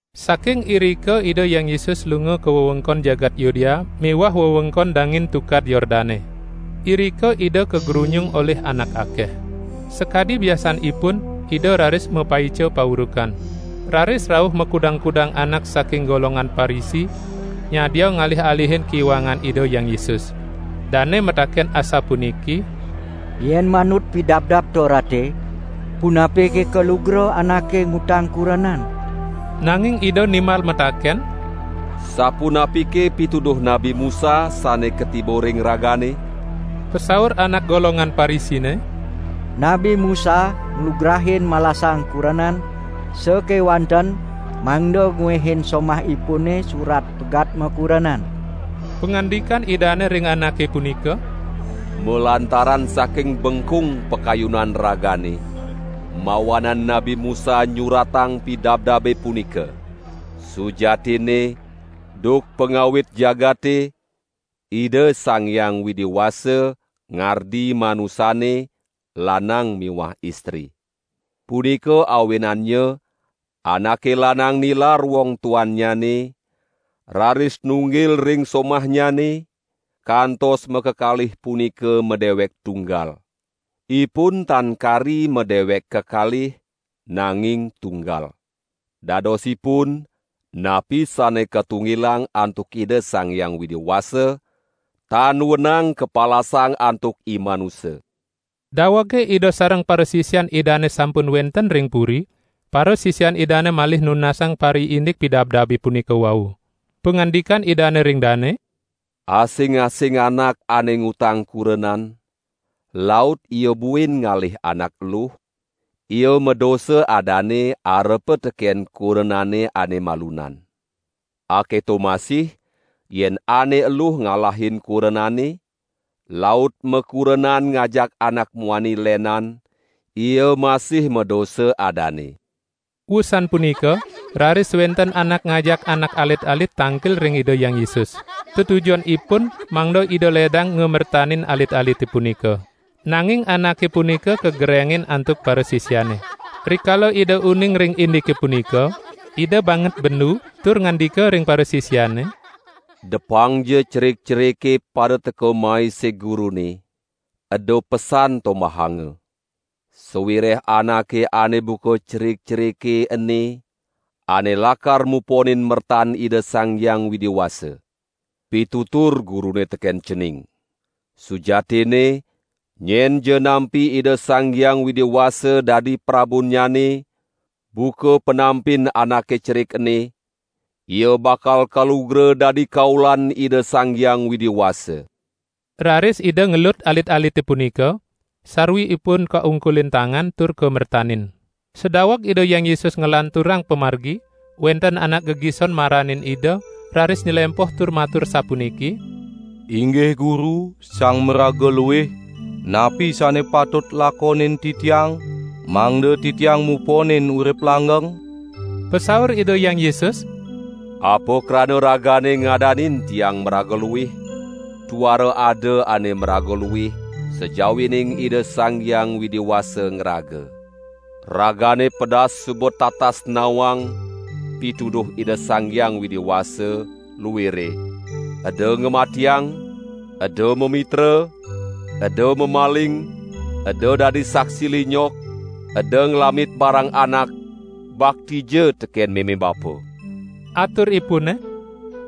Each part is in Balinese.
Saking irika Ida Hyang Yesus lunga ka wewengkon jagat Yudea miwah wewengkon dangin Tukad Yordane. Irika Ida kagrunyung olih anak akeh. Sakadi biasanipun Ida raris mapaica paurukan. Raris rauh makudang-kudang anak saking golongan Parisi nyadia ngalih-alihin kiwangan Ida Hyang Yesus. Dane mataken asapuniki: "Yen manut Pidabdab Torate, punapike kalugra anake ngutang kurenan?" Nanging Ida nimbal mataken: "Sapunapike pituduh Nabi Musa sane katiba ring ragane?" Pasaur anak golongan Parisine: "Nabi Musa nglugrain malasang kurenan sakewanten mangda nguehin somahipune surat pegat makurenan." Pangandikan Idane ring anake punika: "Malantaran saking bengkung pakayunan ragane, mawanan Nabi Musa nyuratang pidabdabe punika. Sujatinne, duk pangawit jagate, Ida Sang Hyang Widi Wasa ngardi manusane lanang miwah istri. Punika awinannya anake lanang nilar wong tuannyane, raris nunggil ring somahnyane, kantos makakalih punika madewek tunggal. Ipun tan kari madewek kekalih, nanging tunggal. Dadosipun, napi sane katunggilang antuk Ida Sang Hyang Widi Wasa, tan wenang kapalasang antuk imanusa!" Dawege Ida sareng parasisian Idane sampun wenten ring puri, parasisian Idane malih nunasang pariindik pidabdabe punika wau. Pangandikan Idane ring dane: "Asing-asing anak ane ngutang kurenan, laut ia buin ngalih anak eluh, ia madosa adane arepa teken kurenane ane malunan. Aketo masih yen ane eluh ngalahin kurenane, laut makurenan ngajak anak muani lenan, ia masih madosa adane." Wusan punika raris wenten anak ngajak anak alit-alit tangkil ring Ida Hyang Yesus. Tetujonipun mangda Ida ledang ngamertanin alit-alite punika. Nanging anake punika kagerengin antuk parasisiane. Rikala Ida uning ring indike punika, Ida banget bendu tur ngandika ring parasisiane: "Depangja cerik-cerike pada teka mai sig Gurune, eda pesan tombahanga! Sawireh anake ane buka cerik-cerike ene ane lakar muponin mertan Ida Sang Hyang Widi Wasa. Pitutur Gurune teken cening: Sujatinne nyenja nampi Ida Sang Hyang Widi Wasa dadi Prabunnyane buka panampin anake cerik ene, ia bakal kalugra dadi kaulan Ida Sang Hyang Widi Wasa." Raris Ida ngelut alit-alite punika, sarwi ipun kaungkulin tangan tur kamertanin. Sadaweg Ida Hyang Yesus nglanturang pamargi, wenten anak gegison maranin Ida raris nylempoh tur matur sapuniki: "Inggih Guru, sang maraga luih, napi sane patut lakonin titiang mangda titiang muponin urip langgeng?" Pasaur Ida Hyang Yesus: "Apa krana ragane ngadanin Tiang maraga luih? Tuara ada ane maraga luih sajawining Ida Sang Hyang Widi Wasa ngraga. Ragane pedas suba tatas nawang pituduh Ida Sang Hyang Widi Wasa luire: eda ngamatiang, eda mamitra, eda mamaling, eda dadi saksi linyok, eda nglamit barang anak, baktija teken meme bapa!" Aturipune: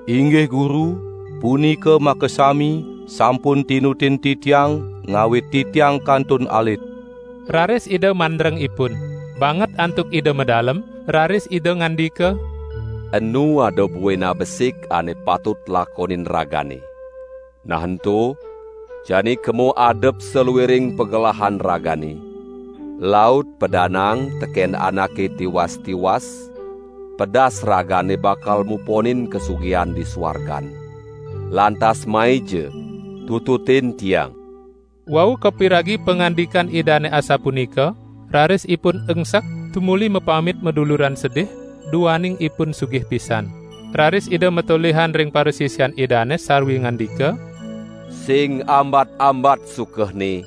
"Inggih Guru, punika makasami sampun tinutin titiang ngawit titiang kantun alit." Raris Ida mandreng ipun. Banget antuk Ida madalem, raris Ida ngandika: "Enu ada buin abesik ane patut lakonin ragane! Nah ento, jani kema adep saluiring pagelahan ragane, laut padanaang teken anake tiwas-tiwas, pedas ragane bakal muponin kasugihan di suargan, lantas maija tututin Tiang!" Wau kapiragi pangandikan Idane asapunika, raris ipun engsek tumuli mapamit maduluran sedih, duaning ipun sugih pisan. Raris Ida matolihan ring parasisian Idane sarwi ngandika: "Sing ambat-ambat sukehne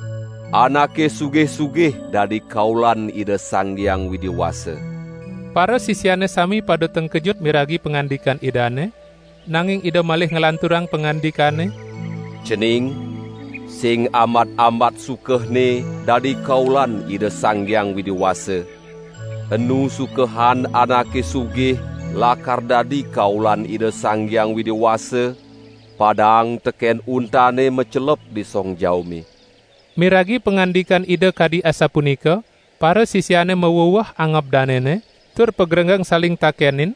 anake sugih-sugih dadi kaulan Ida Sang Hyang Widi Wasa." Parasisiane sami pada tengkejut miragi pangandikan Idane, nanging Ida malih nglanturang pangandikane: "Cening, sing ambat-ambat sukehne dadi kaulan Ida Sang Hyang Widi Wasa. Enu sukehan anake sugih lakar dadi kaulan Ida Sang Hyang Widi Wasa, padaang teken untane macelep di song jaume." Miragi pangandikan Ida kadi asapunika, parasisiane maweweh angob danene, tur pagrenggeng saling takenin: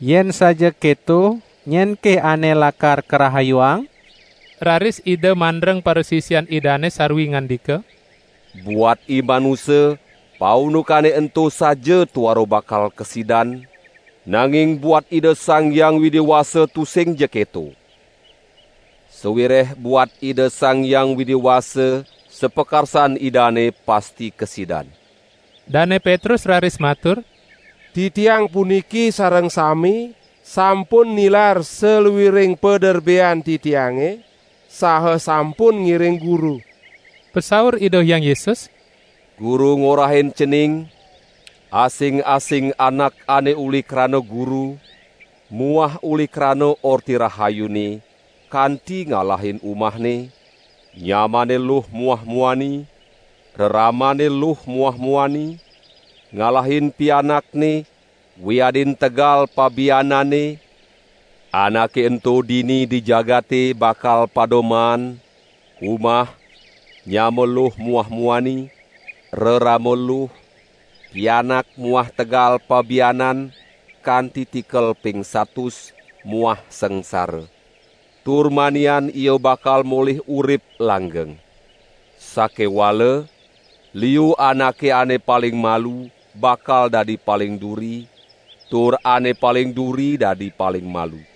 "Yen saja keto, nyenke ane lakar karahayuang?" Raris Ida mandreng parasisian Idane sarwi ngandika: "Buat imanusa paundukane ento saja tuara bakal kasidan, nanging buat Ida Sang Hyang Widi Wasa tusingja keto. Sawireh buat Ida Sang Hyang Widi Wasa sapakarsan Idane pasti kasidan." Dane Petrus raris matur: "Titiang puniki sareng sami sampun nilar saluiring paderbean titiange, saha sampun ngiring Guru!" Pasaur Ida Hyang Yesus: "Guru ngorahin cening, asing-asing anak ane uli krana Guru muah uli krana Orti Rahayune, kanti ngalahin umahne, nyamanne luh muah muani, reramanne luh muah muani, ngalahin pianakne, wiadin tegal pabiananne, anake ento dini di jagate bakal pada maan: umah, nyama luh muah muani, rerama luh, pianak muah tegal pabianan kanti tikel ping satus, muah sangsara. Tur manian ia bakal molih urip langgeng. Sakewala liu anake ane paling malu bakal dadi paling duri tur ane paling duri dadi paling malu."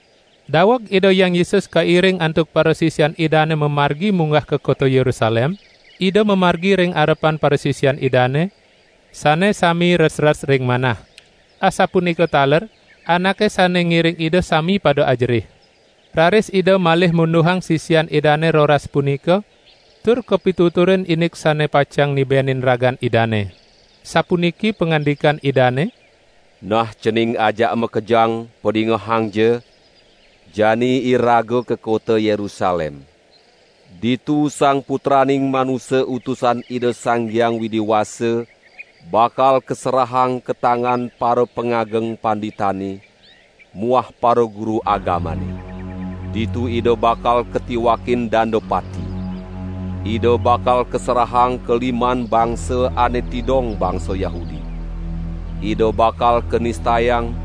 Daweg Ida Hyang Yesus kairing antuk parasisian Idane mamargi munggah ka kota Yerusalem, Ida mamargi ring arepan parasisian Idane, sane sami resres ring manah. Asapunika taler anake sane ngiring Ida sami pada ajerih. Raris Ida malih munduhang sisian Idane roras punika tur kapituturin indik sane pacang nibenin ragan Idane. Sapuniki pangandikan Idane: "Nah cening ajak makejang padingehangja! Jani iraga ka kota Yerusalem. Ditu Sang Putraning Manusa Utusan Ida Sang Hyang Widi Wasa bakal kaserahang ka tangan parapangageng panditane muah paraguru agamane. Ditu Ida bakal katiwakin danda pati. Ida bakal kaserahang ka liman bangsa ane tidong bangsa Yahudi. Ida bakal kanistayang,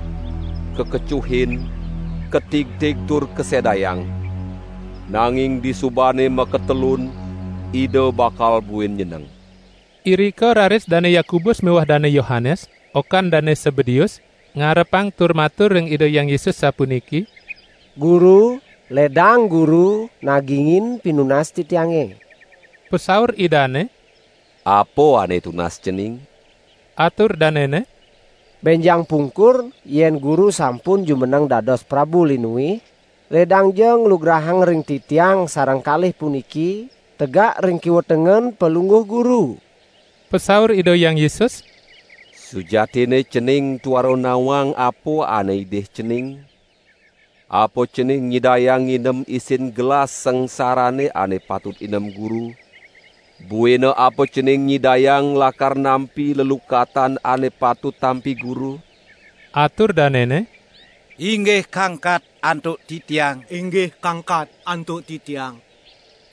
kakecuhin, katigtig tur kasedayang, nanging disubane makatelun Ida bakal buin nyeneng." Irika raris Dane Yakobus miwah Dane Yohanes, okan Dane Sebedeus, ngarepang tur matur ring Ida Hyang Yesus sapuniki: "Guru, ledang Guru nagingin pinunas titiange." Pasaur Idane: "Apa ane tunas cening?" Atur danene: "Benjang pungkur yen Guru sampun jumeneng dados Prabu linuih, ledangja nglugrahang ring titiang sareng kalih puniki tegak ring kiwa tengen Palungguh Guru." Pasaur Ida Hyang Yesus: "Sujatinne cening tuara nawang apa ane idih cening? Apa cening nyidayang nginem isin gelas sangsarane ane patut inem Guru? Buina apa cening nyidayang lakar nampi lelukatan ane patut tampi Guru?" Atur danene: "Inggih kangkat antuk titiang!"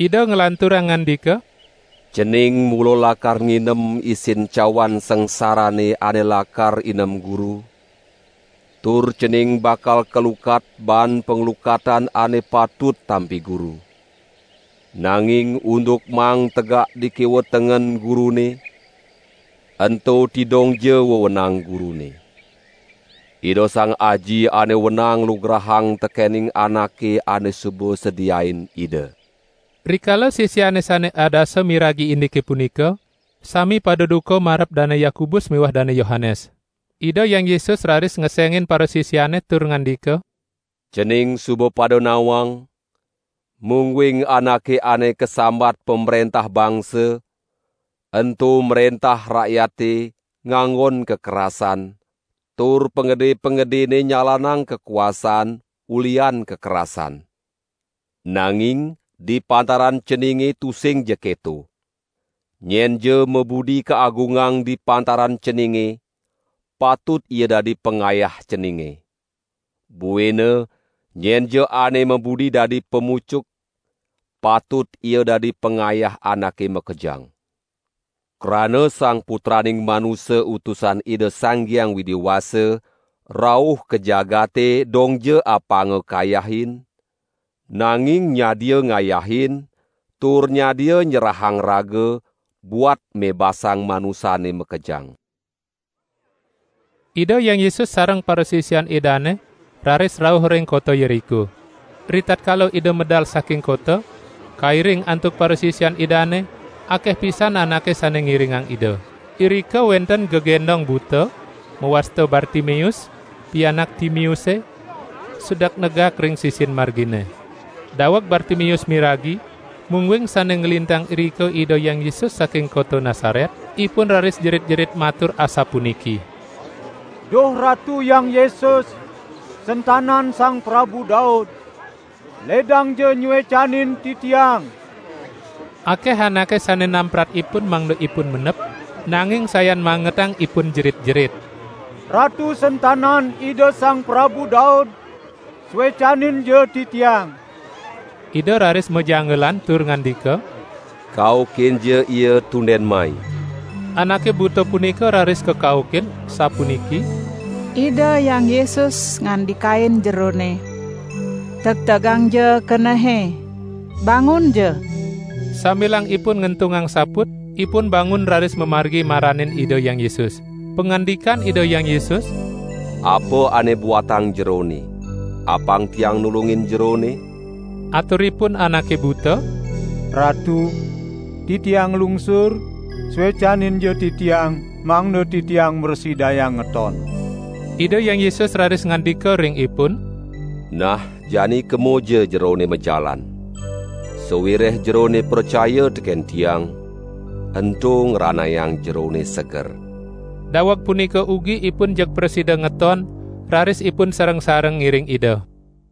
Ida nglanturang ngandika: "Cening mula lakar nginem isin cawan sangsarane ane lakar inem Guru, tur cening bakal kalukat baan panglukatan ane patut tampi Guru. Nanging unduk maang tegak di kiwa tengen Gurune, ento tidongja wewenang Gurune. Ida Sang Aji ane wenang nglugrahang tekening anake ane suba sediain Ida." Rikala sisiane sane adasa miragi indike punika, sami pada duka marep Dane Yakobus miwah Dane Yohanes. Ida Hyang Yesus raris ngesengin parasisiane tur ngandika: "Cening suba pada nawang, mungguing anake ane kasambat pamrentah bangsa, ento mrentah rakyate nganggon kakerasan, tur pangede-pangedene nyalanang kakuasaan ulihan kakerasan. Nanging di pantaran ceninge tusingja keto. Nyenja mabudi kaagungang di pantaran ceninge, patut ia dadi pangayah ceninge. Buina nyenja ane mabudi dadi pamucuk, patut ia dadi pangayah anake makejang. Krana Sang Putraning Manusa Utusan Ida Sang Hyang Widi Wasa rauh ka jagate dongja apanga kayahin, nanging nyadia ngayahin tur nyadia nyerahang raga buat mebasang manusane makejang." Ida Hyang Yesus sareng parasisian Idane raris rauh ring kota Yeriko. Ritatkala Ida medal saking kota, kairing antuk parasisian Idane, akeh pisan anake sane ngiringang Ida. Irika wenten gegendong buta, mawasta Bartimeus, pianak Timeuse, sedek negak ring sisin margine. Daweg Bartimeus miragi mungguing sane nglintang irika Ida Hyang Yesus saking kota Nasaret, ipun raris jerit-jerit matur asapuniki: "Duh Ratu Hyang Yesus, sentanan Sang Prabu Daud, ledangja nyuecanin titiang!" Akeh anake sane namprat ipun mangda ipun mendep, nanging sayan mangetang ipun jerit-jerit: "Ratu sentanan Ida Sang Prabu Daud, suecaninja titiang!" Ida raris majanggelan tur ngandika: "Kaukinja ia tunden mai." Anake buta punika raris kakaukin, sapuniki: "Ida Hyang Yesus ngandikain jerone; tegtegangja kenehe, bangunja." Sambilang ipun ngentungang saput, ipun bangun raris mamargi maranin Ida Hyang Yesus. Pangandikan Ida Hyang Yesus: "Apa ane buatang jerone, apang Tiang nulungin jerone?" Aturipun anake buta: "Ratu, titiang nglungsur, suecaninja titiang mangda titiang mrasidayang ngeton!" Ida Hyang Yesus raris ngandika ring ipun: "Nah jani kemaja jerone majalan, sawireh jerone pracaya teken Tiang, ento ngranayang jerone seger!" Daweg punika ugi ipun jeg prasida ngeton, raris ipun sareng-sareng ngiring Ida.